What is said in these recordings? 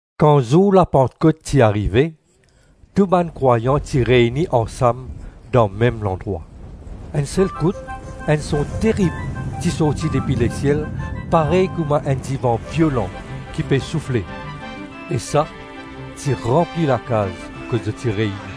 Kan zour Lapantkot ti arive, tou bann krwayan ti reyni ansam dan mem landrwa. Enn sel kout enn son terib ti sorti depi lesiel parey kouma enn divan violan ki pe soufle, e sa ti ranpli lakaz kot zot ti reyni.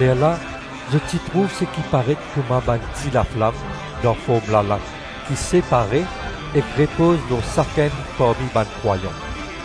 Lerla zot ti trouv seki paret kouma bann ti laflam dan form lalang, ki separe ek repoz lor sakenn parmi bann krwayan.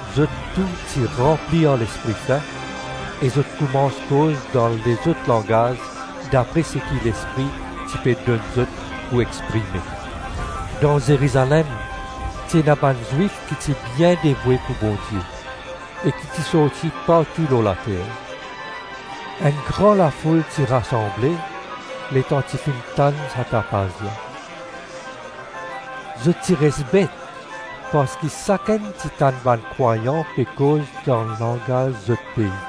Zot tou ti ranpli ar Lespri Sin e zot koumans koz dan lezot langaz dapre seki Lespri ti pe donn zot pou exprime. Dan Zerizalem ti ena bann Zwif ki ti bien devoue pou Bondie, e ki ti sorti partou lor later. Enn gran lafoul ti rasanble letan ti finn tann sa tapaz la. Zot ti res bet parski sakenn ti tann bann krwayan pe koz dan langaz zot pei.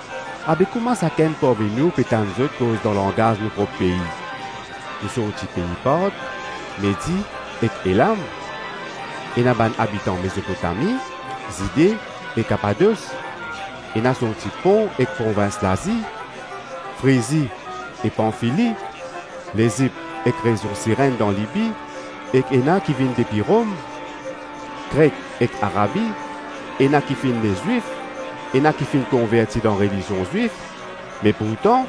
Abe kouma sakenn parmi nou pe tann zot koz dan langaz nou prop pei? Nou sorti pei Part, Medi ek Elam. Ena bann abitan Mezopotami, Zide e Kapados, ena sorti Pon ek provins Lazi, Frizi e Panfili, Lezip ek rezion Sirenn dan Libi, ek ena ki vinn depi Rom, Kret ek Arabi; ena ki finn ne Zwif, ena ki finn konverti dan relizion Zwif - me pourtan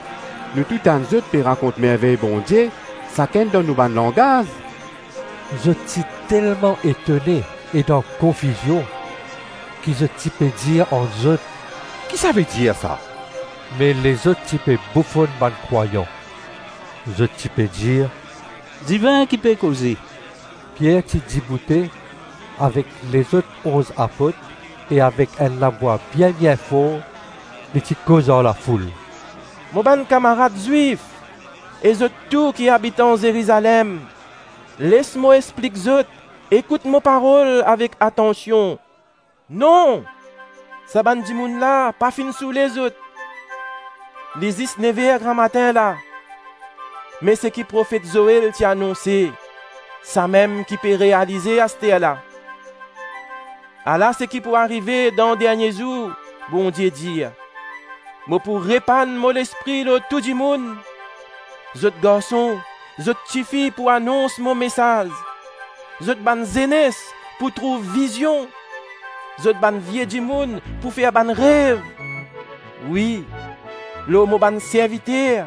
nou tou tann zot pe rakont mervey Bondie sakenn dan nou bann langaz!” Zot ti telman etone e dan konfizion, ki zot ti pe dir ant zot, “Kisavedir, sa?” Me lezot ti pe boufonn bann krwayan; zot ti pe dir, “Divin ki pe koze.” Pier ti diboute avek lezot onz apot e avek enn lavwa bien-bien for li ti koz ar lafoul, “Mo bann kamarad Zwif e zot tou ki abitan Zerizalem, les mo explik zot, ekout mo parol avek atansion. Non, sa bann dimoun la pa finn soule zot, li zis nev-er gramatin la. Me seki profet Zoel ti anonse, samem ki pe realize asterla: ‘Ala seki pou arive dan dernie zour, Bondie dir, Mo pou repann mo Lespri lor tou dimoun. Zot garson, zot tifi pou anons mo mesaz; zot bann zenes pou trouv vizion, zot bann vie dimoun pou fer bann rev. Wi, lor mo bann serviter,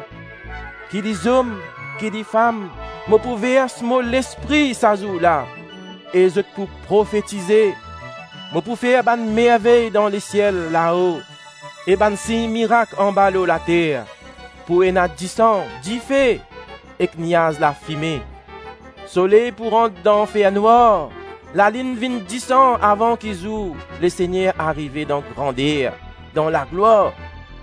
ki li zom ki li fam, mo pou vers mo Lespri sa zour la; e zot pou profetize. Mo pou fer bann mervey dan lesiel lao e bann sign mirak anba lor later, pou ena disan, dife, ek niaz lafime, soley pou rant dan fernwar, lalinn vinn disan avan ki zour Lesegner arive dan grander, dan laglwar.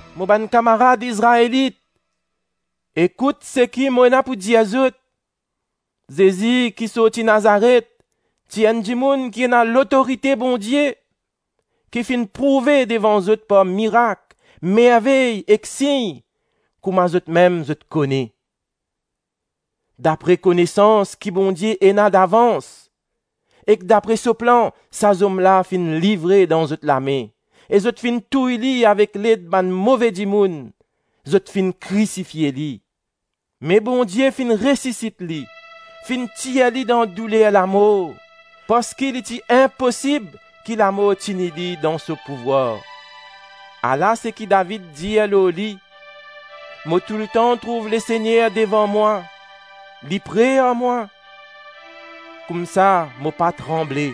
Mo bann kamarad Izraelit, ekout seki mo ena pou dir zot: Zezi ki sorti Nazaret, ti enn dimoun ki ena lotorite Bondie, ki finn prouve devan zot par mirak, mervey ek sign, kouma zotmem zot kone. Dapre konesans ki Bondie ena davans, ek dapre so plan, sa zom la finn livre dan zot lame, e zot finn touy li avek led bann move dimoun; zot finn krisifie li. Me Bondie finn resisit li, finn tir li dan douler lamor, parski li ti inposib ki lamor tini li dan so pouvwar. Ala seki David dir lor li: ‘Mo toultan trouv Lesegner devan mwa; Li pre ar mwa, koumsa mo pa tranble.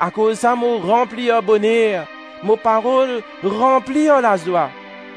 Akoz sa mo ranpli ar boner, mo parol ranpli ar lazwa.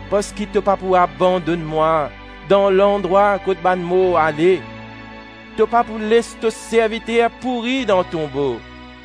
parski to pa pou abandonn mwa dan landrwa kot bann mor ale to pa pou les to serviter pouri dan tonbo.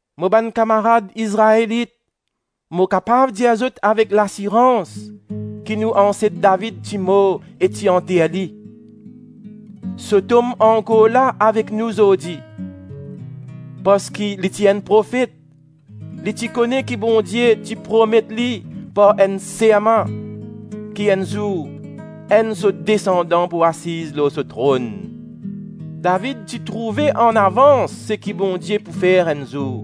Mo bann kamarad Izraelit, mo kapav dir zot avek lasirans ki nou anset David ti mor e ti anter li. So tom ankor la avek nou zordi. Parski li ti enn profet, li ti kone ki Bondie ti promet li par enn serman ki enn zour enn so desandan pou asiz lor so tronn. David ti trouve anavans seki Bondie pou fer enn zour,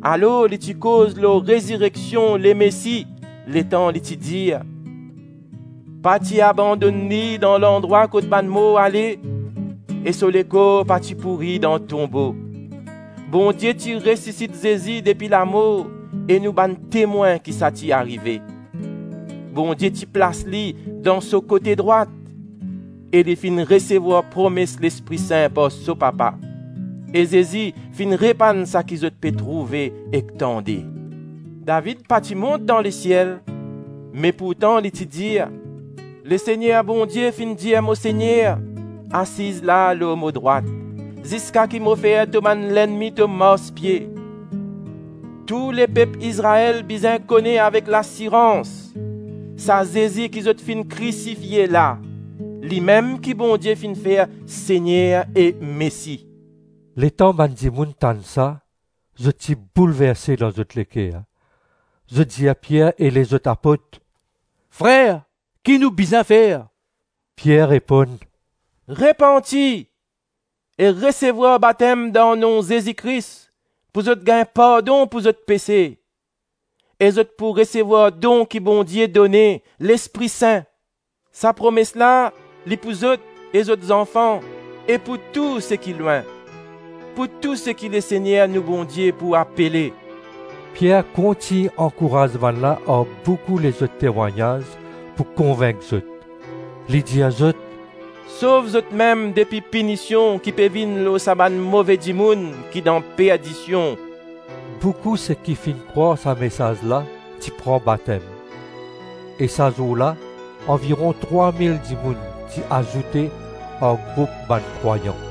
alor li ti koz lor rezireksion Lemesi letan li ti dir: ‘Pa ti abandonn li dan landrwa kot bann mor ale, e so lekor pa ti pouri dan tonbo.’ Bondie ti resisit Zezi depi lamor e nou bann temwin ki sa ti arive. Bondie ti plas li dan so kote drwat, e li finn resevwar promes Lespri Sin par so Papa; e Zezi finn repann saki zot pe trouve ek tande. David pa ti mont dan lesiel, me pourtan li ti dir: ‘Lesegner Bondie finn dir mo Segner: asiz la lor mo drwat, ziska ki mo fer to bann lennmi to marspie.’ Tou lepep Izrael bizin kone avek lasirans: sa Zezi ki zot finn krisifie la, limem ki Bondie finn fer Segner e Mesi!” Letan bann dimoun tann sa zot ti boulverse dan zot leker, zot dir Pier e lezot apot, “Frer, ki nou bizin fer?” Pier reponn, “Repanti, e resevwar batem dan nom Zezi Kris pou zot gagn pardon pou zot pese; e zot pou resevwar don ki Bondie done, Lespri Sin. Sa promes la li pou zot e zot zanfan, e pou tou seki lwin - pou tou seki Lesegner nou Bondie pou apele.” Pier kontign ankouraz bannla ar boukou lezot temwagnaz pou konvink zot; li dir zot, “Sov zotmem depi pinision ki pe vinn lor sa bann move dimoun ki dan perdision.” Boukou seki finn krwar sa mesaz la ti pran batem, e sa zour la anviron trwa-mil dimoun ti azoute ar group bann krwayan.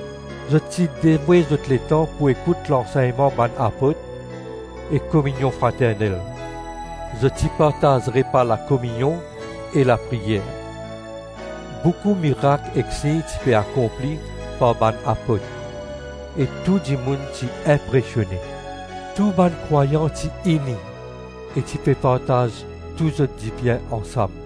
Zot ti devoue zot letan pou ekout lansegnman bann apot e kominion fraternel, zot ti partaz repa lakominion e lapriyer. Boukou mirak ek sign ti pe akonpli par bann apot, e tou dimoun ti inpresione. Tou bann krwayan ti ini e ti pe partaz tou zot dibien ansam.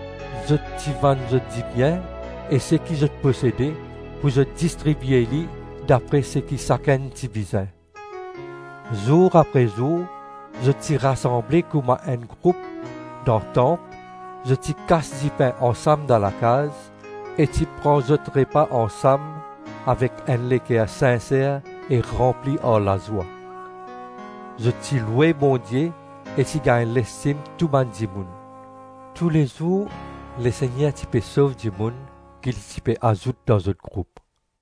Zot ti vann zot dibien e seki zot posede, pou zot distribie li dapre seki sakenn ti bizin. Zour apre zour zot ti rasanble kouma enn group dan Tanp, zot ti kas dipin ansam dan lakaz, e ti pran zot repa ansam avek enn leker sinser e ranpli ar lazwa. Zot ti loue Bondie e ti gagn lestim tou bann dimoun. Toulezour Lesegner ti pe sov dimoun ki li ti pe azout dan zot group.